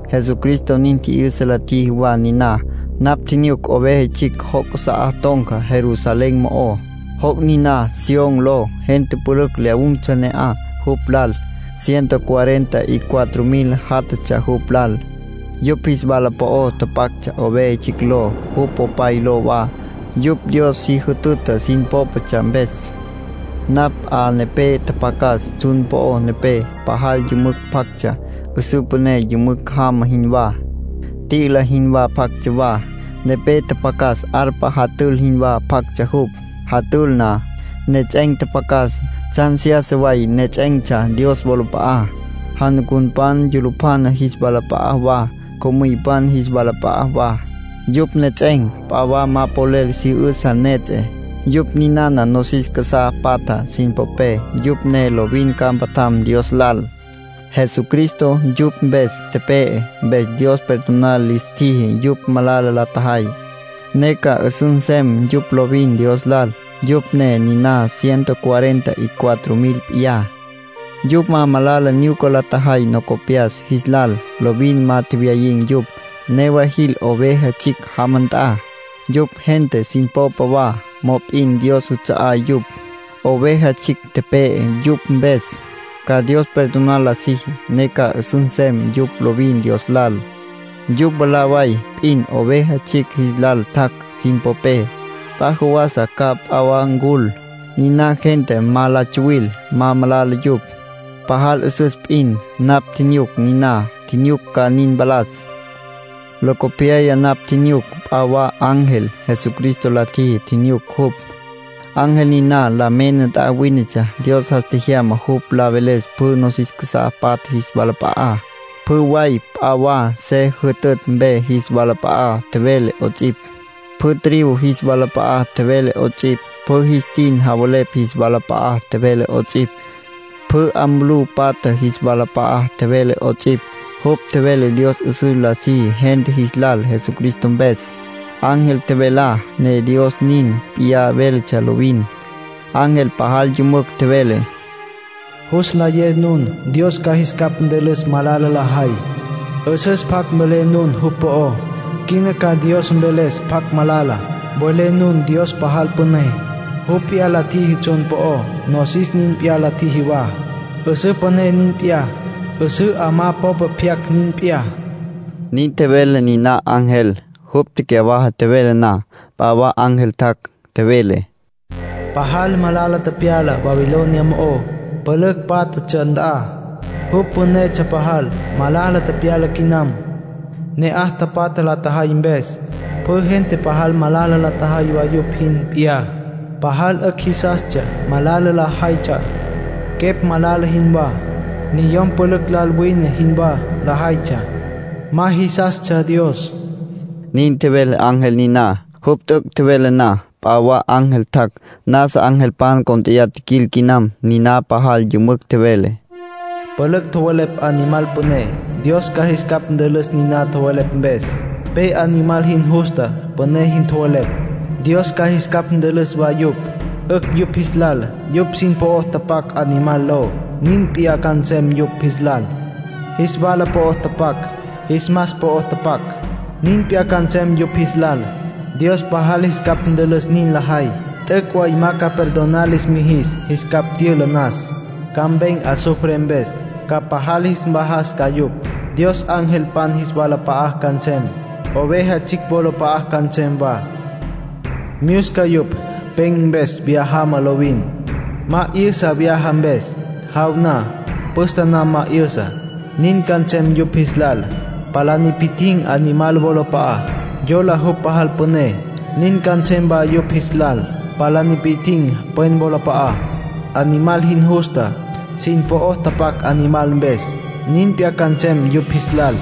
Jesucristo nin tji'yüsa la tjiji wa niná. Napj tjinyuc Oveja Tsjicj joc' casa'á ton̈ca Jerusalén mo'ó. Joc' niná Sión ló. Gente pülücj lyawun̈tsja ne'aj jupj lal. Ciento cuarenta y cuatro mil játjatsja jupj lal. Yupj jis wala po'o tapactsja Oveja Tsjicj ló, jupj Popay ló wa, yupj Dios si jütüta sin pópatsja mpes. Napj 'a nepé tjapjacas tsjun po'ó nepé. Pajal yümücj pjactsja, 'üsǘ püné yümücj jama jinwá, t'i'ila jinwá pjactsja wa. Nepé tjapjacas arpa jatül jinwá pjactsja jupj. Jatül na, nejets'en̈ tjapjacas. Tsjan seyasa way nejets'en̈tsja Dios wolap'a'á, janucunpan yulupjana jis walap'a'á wa, co'müypan jis walap'a'á wa. Yupj nejets'en̈ p'a wa ma polel si 'üsǘ nejets'e. Yupj ninana nosis casá patja sin popé, yupj ne lovin ca mpatjam Dios lal. Jesucristo yupj mpes tepe'e, mpes Dios perdonar lis tjiji yupj malala la tjajay, ne ca 'üsüs nsem yupj lovin Dios lal. Yupj ne niná ciento cuarenta y cuatro mil p'iyá. Yupj ma malala nyuca la tjajay locopyas jis lal. Lovin ma tjewyayin̈ yupj. Newa jil Oveja Tsjicj jama nt'a. Yupj gente sin popa wa, mop'in Dios juts'a'á yupj. Oveja Tsjicj tepe'e yupj mpes, ca Dios perdonar la siji, ne ca 'üsüs nsem yupj lovin Dios lal. Yupj mwalá way p'in Oveja Tsjicj jis lal tjac' sin popé, p'a jawasa ca p'a wa ncul. Niná gentá ma la tsuwil, ma malala yupj; pajal 'üsüs p'in. Napj tjinyuc niná. Tjinyuc ca nin mpalas. Locopyaya napj tjinyuc p'a wa ángel, Jesucristo la tjiji tjinyuc jupj. Ángel niná la mena nt'a wínetsja. Dios jas tjejyama jupj la veles pjü nosis casá patja jis walap'a'á. Pjü way p'a wa se jütütj mpe jis walap'a'a tjevele 'ots'ipj, pjü tribu jis walap'a'a tjevele 'ots'ipj, pjü jis tin javelepj jis walap'a'a tjevele 'ots'ipj, pjü 'a mulú patja jis walap'a'a tjevele 'ots'ipj. Jupj tjevele Dios 'üsüs la siji gente jis lal Jesucristo mpes. Ángel tjevelá ne Dios nin p'iyá véletsja lovin. Ángel pajal yümücj tjevele: “Jus nlayé nun Dios ca jis capj ntülüs malala lajay. 'Üsüs pjac mvelé nun jupj po'ó. Quina ca Dios mveles pjacj malala. Mvelé nun Dios pajal püné. Jupj p'iyá la tjiji tsjun po'ó, nosis nin p'iyá la tjiji wa, 'üsǘ püné nin p'iyá, 'üsǘ 'amá popa pyacj nin p'iyá”, nin tjevele niná ángel. Jupj tecyawaja tjevele na, p'a wa ángel tjac', tjevele: “Pajal malala tepyala Babilonia mo'ó, pülücj pátjatsja nt'a. Jupj pünetsja pajal; malala tepyala quinam. Ne'aj tapatja la tjajay mpes, pjü gente pajal malala la tjajay wa yupj jin p'iyá. Pajal 'ücj jisastsja malala lajaytsja, quepj malala jinwá. Niyom pülücj lal wine jinwá lajaytsja. Ma jisastsja Dios”, nin tjevele ángel niná. Jupj t'üc' tjevele na, p'a wa ángel tjac', nasa angelpan cónt'eya tjiquil quinam. Niná pajal yümücj tjevele: “Pülücj tjowelepj Animal püné. Dios ca jis capj ntülüs nin tjowelepj mpes. Pe Animal jin justa püné jin tjowelepj, Dios ca jis capj ntülüs wa yupj. 'Ücj yupj jis lal yupj sin po'o tapac Animal ló, nin p'iyá ca nsem yupj jis lal. Jis wala po'o tapac, jis mas po'o tapac, nin p'iyá ca nsem yupj jis lal. Dios pajal jis capj ntülüs nin lajay. T'üc' way ma ca perdonar lis mijis jis capj tyüla nas. Ca mpen̈ azufre mpes. Ca pajal jis mvajas ca yupj. Dios angelpan jis walap'a'á ca nsem, Oveja Tsjicj wolap'a'a ca nsem wa. Myusca yupj pen̈ mpes viyá jama lovin. Ma 'yü'sa vyaja mpes; jaw na, püste na ma 'yü'sa. Nin ca nsem yupj jis lal, palá nipi'tjin̈ Animal wolap'a'á, yola jupj pajal püné. Nin ca nsem wa yupj jis lal, palá nipi'tjin̈ pwen wolap'a'á, Animal jin justa. Sin po'o tapac Animal mpes, nin p'iyá ca nsem yupj jis lal”,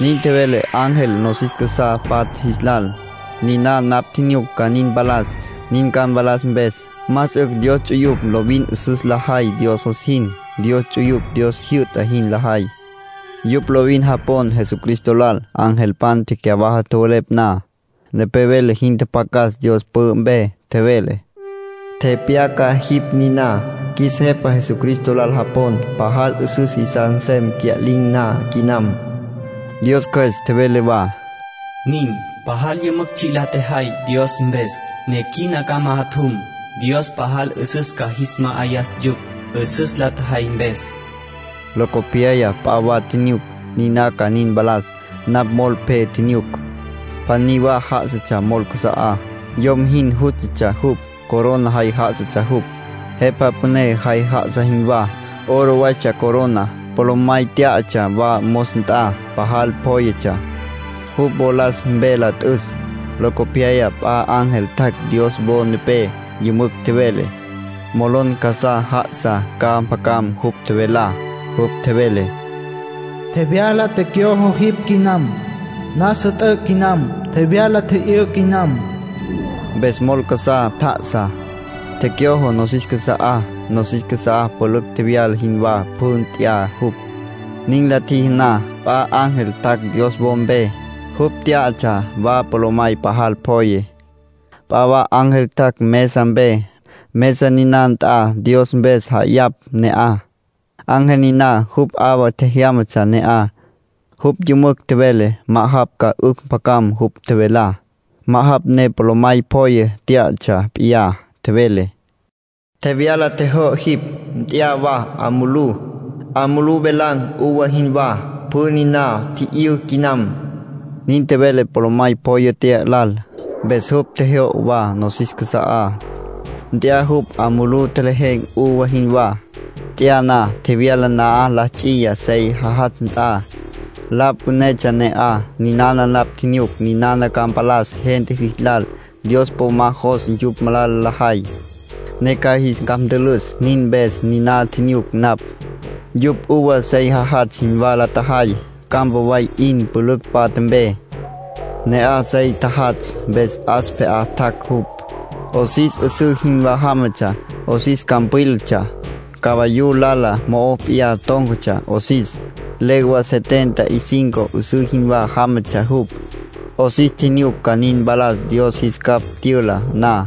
nin tjevele ángel nosis casá patja jis lal. Niná napj tjinyuc ca nin mpalas. Nin ca mpalas mpes, más 'ücj Dios ts'uyupj lovin 'üsüs lajay Dios jos jin. Dios ts'uyupj Dios jyü'ta jin lajay. Yupj lovin japon Jesucristo lal. Angelpan tecyawaja tjowelepj na, nepé vele jin tjapjacas Dios pü'ü mpe. Tjevele: “Tepyaca jipj niná: ‘Qjuis Jepa Jesucristo lal japon, pajal 'üsüs jisas nsem cya'lin̈ na quinam’”. Dios Cjües tjevele wa: “Nin. Pajal yümücj tsji' la tjajay Dios mpes, ne quina ca majatjum. Dios pajal 'üsüs ca jis ma'ayas yupj, 'üsüs la tjajay mpes.” Locopyaya p'a wa tjinyuc, niná ca nin mpalas. Napj mol pje tjinyuc. Pjaní wa já'asatsja mol casa'á. Yom jin jústatsja jupj. Corona jay já'asatsja jupj, jepa püné jay já'asa jinwá. Oro waytsja coroná. Polomay tyá'atsja wa mos nt'a, pajal pjóyetsja, jupj wolas mpe la t'üs. Locopyaya p'a ángel tjac' Dios wo nepé. Yümücj tjevele, molon casá já'asa ca mpjacam jupj tjevelá. Jupj tjevele: “Tjevyala tjejyo'o jipj quinam. Nasa t'üc' quinam. Tjevyala tji'yǘ quinam.” Mpes mol casá tja'asá, tjejyo'o nosis casa'á. Nosis casá pülücj tjevyala jinwá pjü nt'ya jupj. Nin la tjiji na, p'a ángel tjac' Dios wo mpe. Jupj tyá'atsja wa polomay pajal pjoye. P'a wa ángel tjac' mesa mpe, mesa niná nt'a Dios mpes ja'ayapj ne'aj. Ángel niná, jupj 'awa tjejyámatsja ne'aj. Jupj yümücj tjevele, ma'ajapj ca 'ücj mpjacam jupj tjevelá, ma'ajapj ne polomay pjoye tyá'atsja p'iyá. Tjevele: “Tjevyala tjejyo'o jipj. Nt'ya wa 'a mulú, 'a mulú velan̈ uva jinwá. Pjü niná tji'yǘ quinam”, nin tjevele polomay pjoye tya'a lal. Mpes jupj tjejyo'o wa nosis casa'á, nt'ya jupj 'a mulú tjevelan̈ uva jinwá. Nt'ya na, tjevyala na'aj la ts'iya sey jajatsj nt'a. La pünetsja ne'aj. Ninana napj tjinyuc ninana ca mpalas gente jis lal. Dios po ma jos yupj malala lajay, ne ca jis capj ntülüs; nin mpes niná tjinyuc napj. Yupj uva sey jajatsj jinwá la tjajay, campa way 'in, pülücj patja mpe. Ne'aj sey tjajatsj, mpes 'as pje'á tjac' jupj. 'Osis 'üsǘ jinwá jámatsja. 'Osis campwílatsja. Cavayú lala mo'ó p'iyá tón̈catsja 'osis. Legua setenta y cinco 'üsǘ jinwá jámatsja jupj, 'osis. Tjinyuc ca nin mpalas Dios jis capj tyüla na.